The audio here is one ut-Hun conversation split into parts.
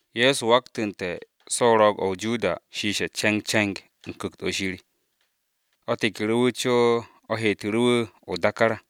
Ye̱so waktu̱nte̱ so̱ o-ro̱o̱g o-Joda shiishe̱ ce̱ngce̱ng u̱n Ku̱kt-o Shir, o̱ tekeru̱ wu̱ co o̱ heetu̱ru̱ wu̱ o-dákár.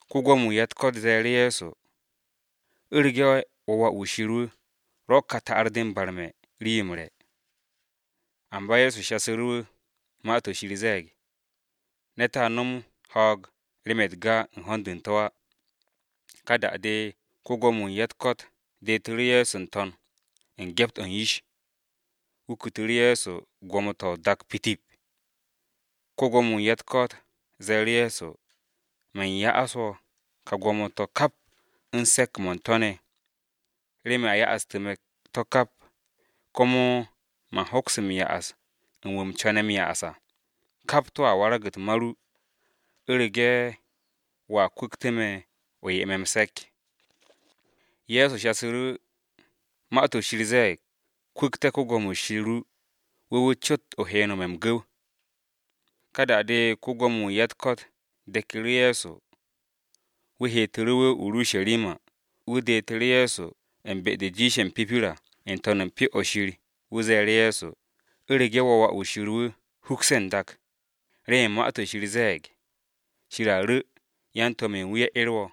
Ko-Gwo̱mo-wu̱ u̱n ya-u̱t-ko̱t ze̱e̱ru̱ Ye̱so, “U̱rege̱ wo̱ wà-wu̱ Shir wu̱, rwo̱ ka ta'ar-de barme̱ rii-yo m-re̱.” Amba Ye̱so shasu̱ru̱, “Ma-to̱ Shir ze̱e̱g, ‘Ne̱t a no̱m ho̱o̱g remen u̱t-ga u̱n ho̱n-de u̱n to̱ á.’” Ka da-de ko-Gwo̱mo-wu̱ u̱n ya-u̱t-ko̱t detu̱ru̱ wu̱ n-to̱n. U̱n gyept-o̱ u̱n yish, wu̱ kutu̱ru̱ Ye̱so gwo̱mo-to̱ o-dak pitip. Ko-Gwo̱mo-wu̱ u̱n ya-u̱t-ko̱t ze̱e̱ru̱ Ye̱so, “Man ya'as wo̱ ka gwo̱mo-to̱ kap u̱n se̱ps-mo̱ u̱n to̱ ne̱, remen a ya'astu̱ me̱ to̱ kap, komo man hoks m-ya'as u̱n wu̱ u̱m co̱ne̱ m-ya'as à. Kap to̱a warag-u̱t ma ru, u̱rege̱ wo̱a kwu̱ktu̱ me̱, o 'ye me̱ m-se̱k.” Ye̱so shasu̱ru̱, “Ma-to̱ Shir ze̱e̱g, ‘Kwu̱kte̱ Yawe Shir ru, wu̱ wu̱ cot o he m-nome̱ m-gu̱w!’” Ka da-de, ko-Gwo̱mo-wu̱ u̱n ya-u̱t-ko̱t deku̱ru̱ Ye̱so, wu̱ heteru̱ wu̱ o-Urusharima. Wu̱ detu̱ru̱ Ye̱so u̱n be-de jiishe̱ m-pipir à, n-to̱n u̱n Pyo-o̱ Shir, wu̱ ze̱e̱ru̱ Ye̱so, “U̱rege̱ wo̱ wà-wu̱ Shir wu̱ hukse̱ n-dak, remen Ma-to̱ Shir ze̱e̱g, ‘Shir a ru̱ yan-to̱m-ye̱ u̱n wu̱ ye̱ 'er wo̱.’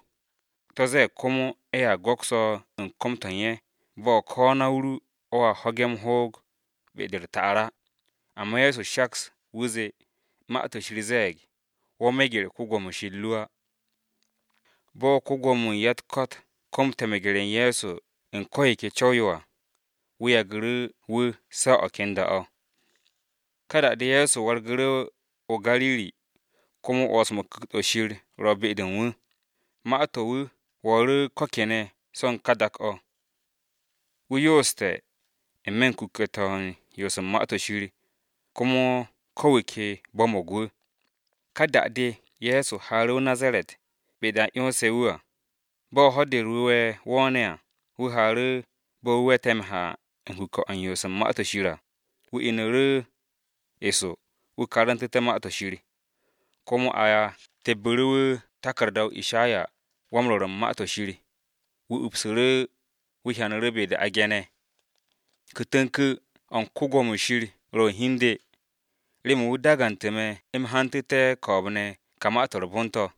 To̱ ze̱e̱g komo, ‘Ye̱a go̱ks wo̱ u̱n kom-to̱ u̱n ye̱ bo̱ ko̱ na-o ru o̱a ho̱ge̱ m-hoog be-de u̱t-ta'ar à.’” Amba Ye̱so shaks, wu̱ zee, “Ma-to̱ Shir ze̱e̱g, ‘Wo̱ meger Yawe Shir ru á.’” Bo̱ ko-Gwo̱mo-wu̱ u̱n ya-u̱t-ko̱t komte̱ meger-u̱t Ye̱so u̱n ko̱ yo ke co̱w-yo à, wu̱ yagu̱ru̱ wu̱ se̱ o̱ ken da-o̱. Ka da-de Ye̱so wargu̱ru̱ o-Gariri, komo 'wo̱ns-mo̱ u̱n Ku̱kt-o Shir ro̱ be-de u̱n wu̱. Ma-to̱ u̱n wu̱ wo̱o̱ru̱ ko kene̱ so̱ u̱n ka dak-o̱. Wu̱ yooste̱ n-me̱ u̱n kuke̱-to̱ u̱n yoos u̱n Ma-to̱ Shir, komo ko̱ wu̱ ke bo̱mo̱g wu̱. Ka da-de Ye̱so haaru̱ o-Nazaret, be-de a 'yonse̱ wu̱ à, bo̱ Ho̱-de u̱r-Wu̱we̱ wo̱o̱ne̱ à, wu̱ haaru̱ bo̱ wu̱ we̱te̱ m-ha u̱n kuke̱-o̱ u̱n yoos u̱n Ma-to̱ Shir à. Wu̱ inu̱ru̱ eso wu̱ karantu̱te̱ Ma-to̱ Shir. Komo a tebbu̱ru̱ wu̱ taku̱rda-o̱ Ishayawan-Rwo̱r u̱n Ma-to̱ Shir. Wu̱ upsu̱ru̱, wu̱ hyanu̱ru̱ be-de a ge̱ne̱: “Ku̱kt-o̱ u̱n Yawe ro̱ u̱n hi u̱n de, remen wu̱ dagante̱ me̱ u̱m hantu̱te̱ ko̱o̱b-ne̱ ka Ma-to̱ m-Re̱re̱m to̱.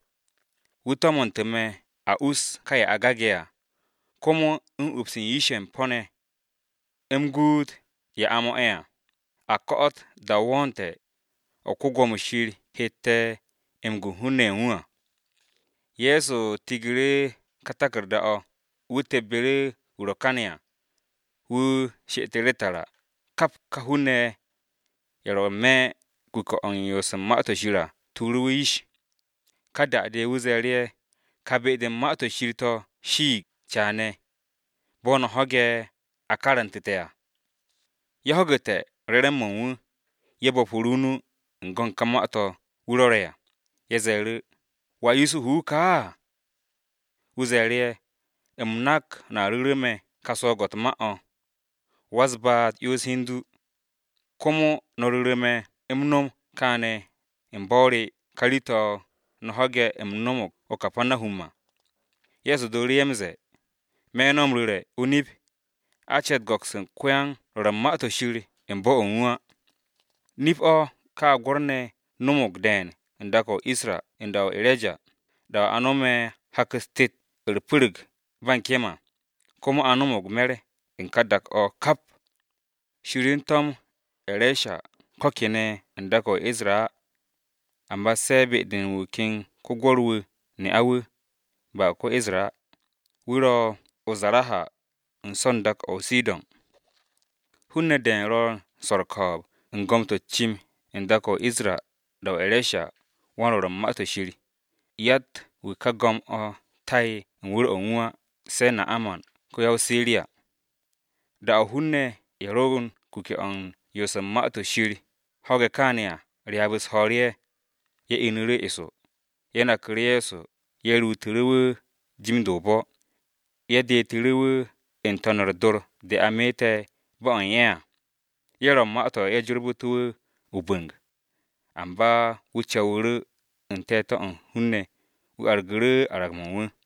Wu̱ to̱mu̱nte̱ me̱ u̱m ko̱'o̱t a us ka ye̱ a gage̱ à, komo u̱n ups u̱n yish-ye̱ u̱n po̱-ne̱ ne̱. U̱m guut ye̱ a mo̱'e̱ à, a ko̱'o̱t da-o wo̱o̱nte̱, o̱ Yawe hette̱ m-gu u̱n hun-ne̱ ye̱ u̱n wu̱ à.” Ye̱so tigu̱ru̱ ka taku̱rda-o̱, wu̱ tebbu̱ru̱ wu̱ ro̱ kane̱ à, wu̱ she'etu̱ru̱ tara. Kap ka hun-ne̱ ye̱, ro n-me̱ kuke̱-o̱ u̱n yoos u̱n Ma-to̱ Shir à tuuru̱ wu̱ yish, ka da-de wu̱ ze̱e̱ ye̱, “Ka be-de u̱n Ma-to̱ Shir to̱ shiig caane̱, bo̱ no̱ ho̱ge̱ a karantu̱te̱ à.” Kap ye̱ ho̱gu̱te̱ re̱re̱m-mo̱ u̱n wu̱, ye̱ bo̱pu̱ru̱ o-nu u̱n go̱n ka gom-to̱ wu̱ rwo̱re̱ à. Ye̱ ze̱e̱ru̱, “¿Wà Yusuhu wu̱ kaa?” Wu̱ ze̱e̱ru̱ ye̱, “U̱m nak no̱a ru̱ru̱ me̱ ka swo̱o̱g-o̱ u̱t-ma o̱, ‘Wa-u̱s-baat 'yons hi u̱n du,’ komo no̱ ru̱ru̱ me̱ u̱m nom kaane̱ u̱n bo̱-o re ka rii-to̱ no̱ ho̱ge̱ u̱m no̱mo̱g o-Kapanahum à.” Ye̱so dooru̱ m-ze̱e̱, “Me̱ no̱ m-ru̱re̱ o-nip, a ce̱t m-go̱ks u̱n ko-yan-rwo̱r u̱n Ma-to̱ Shir u̱n bo̱-o̱ u̱n wu̱ á. “Nip-o̱ gwo̱r-ne̱ no̱mo̱g de̱e̱n u̱n dak-o o-Isra u̱n da-o E̱reja, da-o̱ a no̱me̱ hak-u̱s tet u̱r-pu̱ru̱g ba u̱n kem à, komo a no̱mo̱g me̱r u̱n ka dak-o̱ kap. Shir to̱m E̱reja ko̱ kene̱ u̱n dak-o̱ o-Isra á, amba se̱ be-de u̱n wu̱ ken ko-gwo̱r-wu̱ u̱n ne'a wu̱, ba ko-Isra á, wu̱ ro̱ o-Zaraha u̱n so̱ u̱n dak-o̱ o-Sidon. Hun-ne̱ de̱e̱n ro̱ u̱n swo̱ u̱r-ko̱o̱b u̱n gom-o̱ u̱t-cim n-dak o-Isra da-o E̱reshawan-Rwo̱r u̱n Ma-to̱ Shir, Yatt-wu̱ ka go̱m-o̱ ta'e̱ u̱n wu̱r-o̱ u̱n wu̱ á, se̱ Na'aman ko-ya-o-Siriya.” Da-o̱ hun-ne̱ ye̱ ro̱ u̱n kuke̱-o̱ u̱n yoos u̱n Ma-to̱ Shir ho̱ge̱ kaane̱ à, ryaab-u̱s ho̱o̱ru̱ ye̱. Ye̱ inu̱ru̱ eso, ye̱ naku̱ru̱ Ye̱so ye̱ ruutu̱ru̱ wu̱ jim-de o-bo̱, ye̱ detu̱ru̱ wu̱ n-to̱n u̱r-dor de a meete̱ bo̱-o̱ u̱n ye̱ à. Ye̱ ro̱ u̱n ma-to̱ ye̱ jorbu̱te̱ wu̱ o-bu̱ng. Amba wu̱ co̱wu̱ru̱ u̱n te̱te̱-o̱ u̱n hun-ne̱ wu̱ argu̱ru̱ arag-mo̱ u̱n wu̱.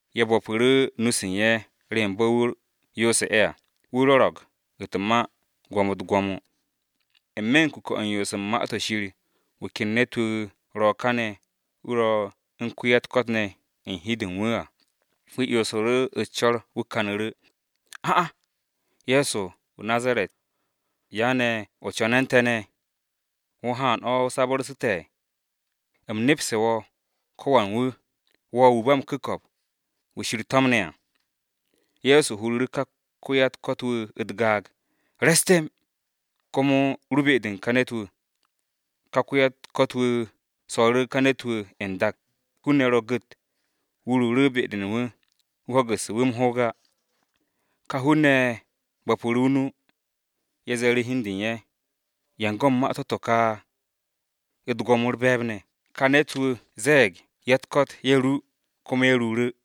Ye̱ bo̱pu̱ru̱ nu-se u̱n ye̱ remen bo̱ wu̱ yoose̱ ye̱ à, wu̱ rwo̱ro̱g u̱t-ma gwo̱mo-u̱t gwo̱mo. N-me̱ u̱n kuke̱-o̱ u̱n yoos u̱n Ma-to̱ Shir, wu̱ ken ne̱t-wu̱ ro̱ kane̱ wu̱ ro̱ u̱n wa-u̱t-ko̱t ne̱ u̱n hi-de u̱n wu̱ à, wu̱ 'yonsu̱ru̱ u̱s-co̱r wu̱ kanu̱ru̱, “A'a! Ye̱so wu̱ o-Nazaret, ¿ya ne̱ o co̱ne̱ u̱n te̱ ne̱? ¿Wo̱ u̱n haan o sabu̱rse̱ te̱? U̱m nepse̱ wo̱, ko wan wu̱: Wo̱ wu̱ ba m-ku̱ko̱p, wu̱ Shir to̱mne̱ à!” Ye̱so huru̱ru̱ ka wa-u̱t-ko̱t wu̱ u̱t-gaag, “Re̱s temb, komo ru be-de u̱n ka ne̱t-wu̱!” Ka wa-u̱t-ko̱t wu̱ so̱ru̱ ka ne̱t-wu̱ n-dak, hun-ne̱ ro̱ gu̱t, wu̱ ruuru̱ be-de u̱n wu̱, wu̱ ho̱gu̱sse̱ wu̱ m-ho̱o̱g á. Ka hun-ne̱ ye̱ bo̱pu̱ru̱ o-nu, ye̱ ze̱e̱ru̱ hi u̱n de u̱n ye̱, “¿Yan go̱n ma-to̱ ne̱ to̱ ka? U̱t-gwo̱mo u̱r-be̱e̱b ne̱ ka ne̱t-wu̱ ze̱e̱ ka ya-u̱t-ko̱t ye̱ ru, komo ye̱ ruuru̱!”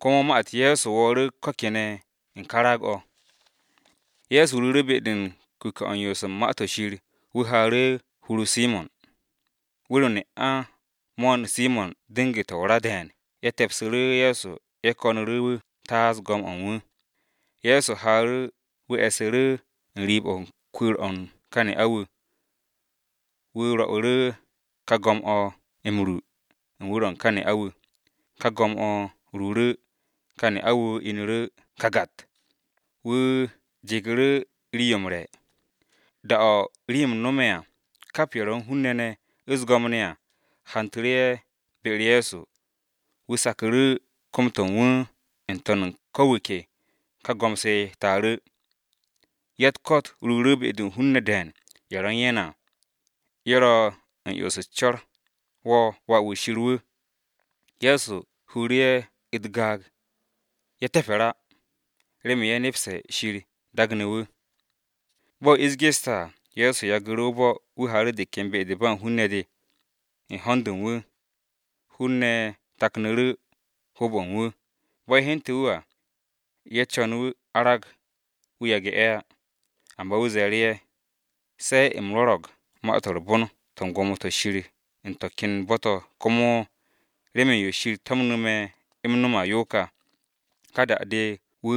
Komo ma-u̱t Ye̱so wo̱o̱ru̱ ko̱ kene̱ u̱n ka raag-o̱. Ye̱so ruuru̱ be-de u̱n kuke̱-o̱ u̱n yoos u̱n Ma-to̱ Shir, wu̱ haaru̱ hur-o Simo̱n. Wu̱r-o mo̱'o̱n Simo̱n ne̱ ne'a dengu̱te̱ o-ra de̱e̱n ye̱ te̱psu̱ru̱ Ye̱so ye̱ ko̱nu̱ru̱ wu̱ taas go̱m-o̱ u̱n wu̱. Ye̱so haaru̱ wu̱ e̱su̱ru̱ u̱n riib-o̱ kwu̱u̱r-o̱ u̱n ka ne'a-wu̱, wu̱ rwo̱'u̱ru̱ ka go̱m-o̱ m-ru u̱n wu̱r-o̱ u̱n ka ne'a-wu̱. Ka go̱m-o̱ ruuru̱, ka ne'a-wu̱ inu̱ru̱ kagat. Wu̱ jegu̱ru̱ ye̱ rii-yo m-re̱. Da-o̱ rim-m no̱me̱ à, kap ye̱ ro̱ u̱n hun-ne̱ ne̱ u̱s-go̱m ne̱ à, hantu̱ru̱ ye̱ be-u̱r Ye̱so, wu̱ saku̱ru̱ kom-to̱ u̱n wu̱ n-to̱n u̱n ko̱ wu̱ ke, ka go̱m-se taaru̱. Ya-u̱t-ko̱t ruuru̱ be-de u̱n hun-ne̱ de̱e̱n ye̱ ro̱ u̱n ye̱ ne̱ à, ye̱ ro̱ u̱n 'yons u̱s-co̱r, “Wo̱ Wà-wu̱ Shir wu̱!” Ye̱so huru̱ ye̱ u̱t-gaag, ye̱ te̱pe̱r á, remen ye̱ nepse̱ Shir daagne̱ wu̱. Bo̱ ish geste̱ à, Ye̱so yagu̱ru̱ o-bo̱ wu̱ haaru̱ de ken be-de ba u̱n hun-ne̱ de, u̱n ho̱n-de u̱n wu̱. Hun-ne̱ taknu̱ru̱ hoob-o̱ u̱n wu̱, bo̱ ye̱ hyente̱ wu̱ à, ye̱ co̱n wu̱ arag, wu̱ yage̱ ye̱ á. Amba wu̱ ze̱e̱ru̱ ye̱, “Se̱ u̱m rwo̱ro̱g Ma-to̱ m-Re̱re̱m to̱ u̱n gwo̱mo-to̱ Shir u̱n to̱ ken bo̱-to̱ komo, remen yo Shir to̱mnu̱ me̱ u̱m no̱m yo ka.” Ka da-de wu̱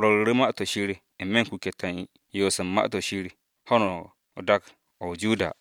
rwo̱ru̱ru̱ Ma-to̱ Shir n-me̱ u̱n kuke̱-to̱ u̱n yoos u̱n Ma-to̱ Shir ho̱no dak-o̱ o-Judiya.